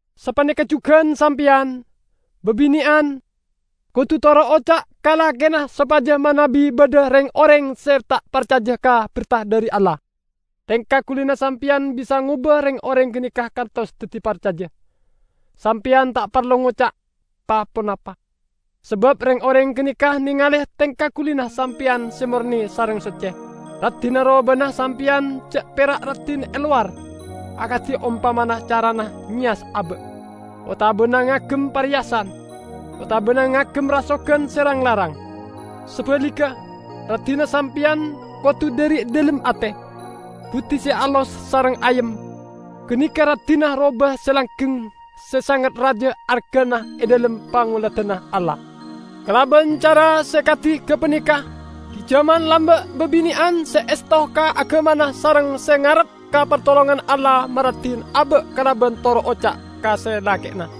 Sapaneka jugan sampeyan, babine'an, kodu toro' oca' ka lakena sopaja manabi badha reng-oreng se ta' parcaja ka berta dhari Allah, tengka gulina sampeyan bisa ngoba reng-oreng ganeka kantos daddi parcaja. Sampeyan ta' parlo ngoca' pa-ponapa, sabab reng-oreng ganeka nengale tengka gulina sampeyan se morne sareng socce. Raddinna robana sampeyan ja' pera' raddin e lowar, akadi ompamana carana ngeyas aba', otabana ngagem pareyasan, otabana ngagem rasogan se rang-larang. Sabaligga, raddinna sampeyan kodu dhari dhalem ate, buddi se alos sareng ayem; ganeka raddinna roba se langgeng se sanget raja argana e dhalem pangoladanna Allah. Kalaban cara se kadi gapaneka gi' jaman lamba' babine'an se esto ka agamana sareng se ngarep ka partolonganna Allah maraddin aba' kalaban toro' oca' ka se lake'na.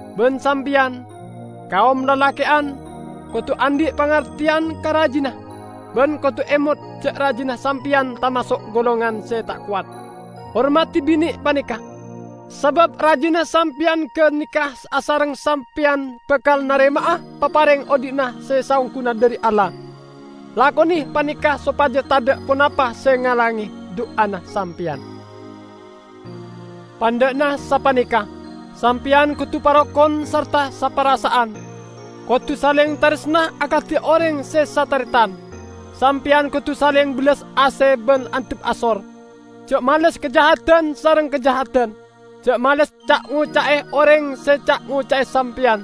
Ban sampeyan, kaom lalake'an, kodu andhi' pangarteyan ka rajina, ban kodu emot ja' rajina sampeyan tamaso' golongan se ta' kowat. Hormadi bine paneka, sabab rajina sampeyan ganeka asareng sampeyan bakal narema'a papareng odhi' se saongguna dhari Allah. Lakone paneka sopaja tadha' ponapa se ngalange du'ana sampeyan. Pandha'na sapaneka: sampeyan kodu parokon sarta saparasa'an. Kodu saleng taresna akadi oreng se sataretan. Sampeyan kodu saleng bellas ase ban andhap asor. Ja' males kajahadan sareng kajahadan, ja' males ca'-ngoca'e oreng se ca'-ngoca'e sampeyan;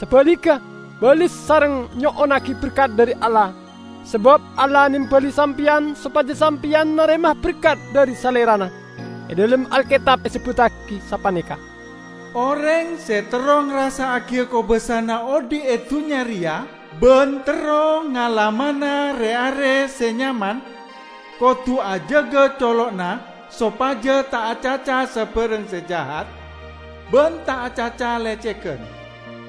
sabaligga bales sareng nyo'onnagi berkat dhari Allah. Sabab Allah nembali sampeyan sopaja sampeyan narema berkat dhari Salerana. E dhalem Alketab esebbuttagi sapaneka, "Oreng se terro ngarassa'agiya kobassana odhi' e dunnya reya ban terro ngalamana re-are se nyaman, kodu ajaga colo'na sopaja ta' acaca sabarang se jahat ban ta' acaca lecegan.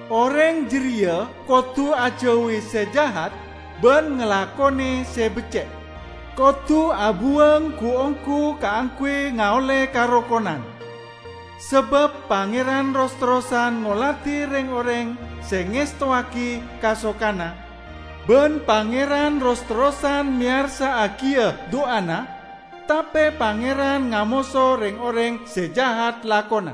Oreng jareya kodu ajauwi se jahat ban ngalakone se becce'; kodu abuwang gu-onggu kaangguy ngaolle karokonan. Sabab Pangeran ros-terrosan ngoladi reng-oreng se ngestowagi kasokanna, ban Pangeran ros-terrosan meyarsa'agi a-du'ana; tape Pangeran ngamoso reng-oreng se jahat lakona."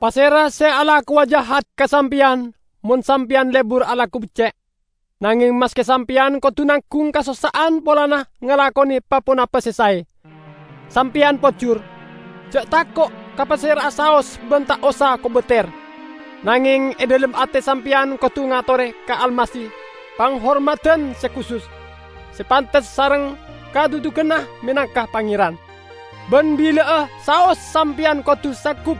Pasera se alakowa jahat ka sampeyan mon sampeyan lebur alako becce'? Nangeng maske sampeyan kodu nanggung kasossa'an polana ngalakone pa-ponapa se sae, sampeyan pojur! Ja' tako' ka pasera'a saos ban ta' osa kobater! Nangeng e dhalem ate sampeyan kodu ngatore ka Almasih panghormadan se kusus, se pantes sareng kadhudhuganna menangka Pangeran. Ban bila'a saos sampeyan kodu sanggup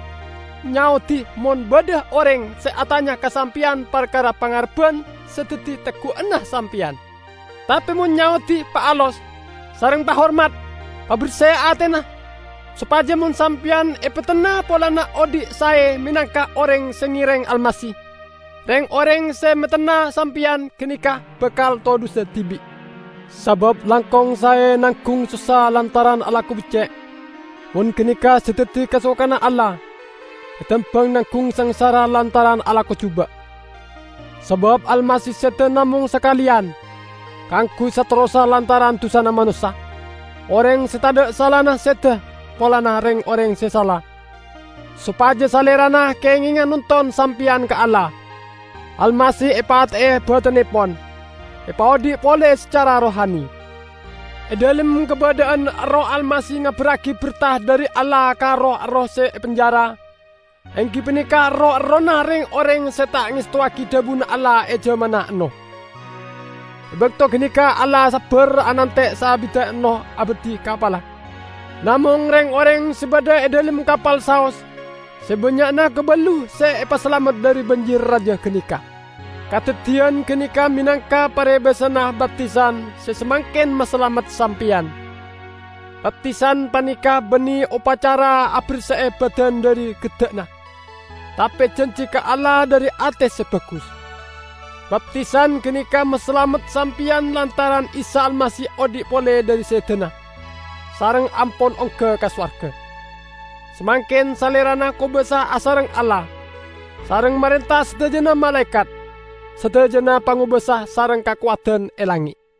nyaodi mon badha oreng se atanya ka sampeyan parkara pangarebban se daddi teggu'anna sampeyan. Tape mon nyaodi paalos, sareng pahormat. Paberse atena, sopaja mon sampeyan epetenna polana odhi' sae menangka oreng se ngereng Almasih, reng-oreng se metenna sampeyan ganeka bakal todhusa dibi'. Sabab langkong sae nanggung sossa lantaran alako becce' -- mon ganeka se daddi kasokanna Allah -- etembang nanggung sangsara lantaran alako juba'. Sabab Almasih seda namong sakaleyan, kaangguy saterrossa lantaran dusana manossa, oreng se tadha' salana seda polana reng-oreng se sala, sopaja Salerana kengenga nonton sampeyan ka Allah. Almasih epate'e badannepon, epaodhi' pole sacara rohani. E dhalem kabadha'an erroh Almasih ngabarragi berta dhari Allah ka roh-erroh se epenjara: enggi paneka roh-errohna reng-oreng se ta' ngestowagi dhabuna Allah e jamanna Ennoh. E bakto ganeka Allah sabbar anante' saabidda Ennoh abadhi kapalla. Namong reng-oreng se badha e dhalem kapal saos -- se bannya'na kaballu -- se epasalamet dhari banjir raja ganeka. Kadaddiyan ganeka menangka parebasanna baptisan se samangken masalamet sampeyan. Baptisan paneka banne opacara aberse'e badan dhari gedda'na, tape janji ka Allah dhari ate se bagus. Baptisan ganeka masalamet sampeyan lantaran Isa Almasih odhi' pole dhari sedana, sareng ampon ongga ka sowarga. Samangken Salerana kobasa asareng Allah, sareng marenta sadajana malaekat, sadajana pangobasa sareng kakowadan e langnge'.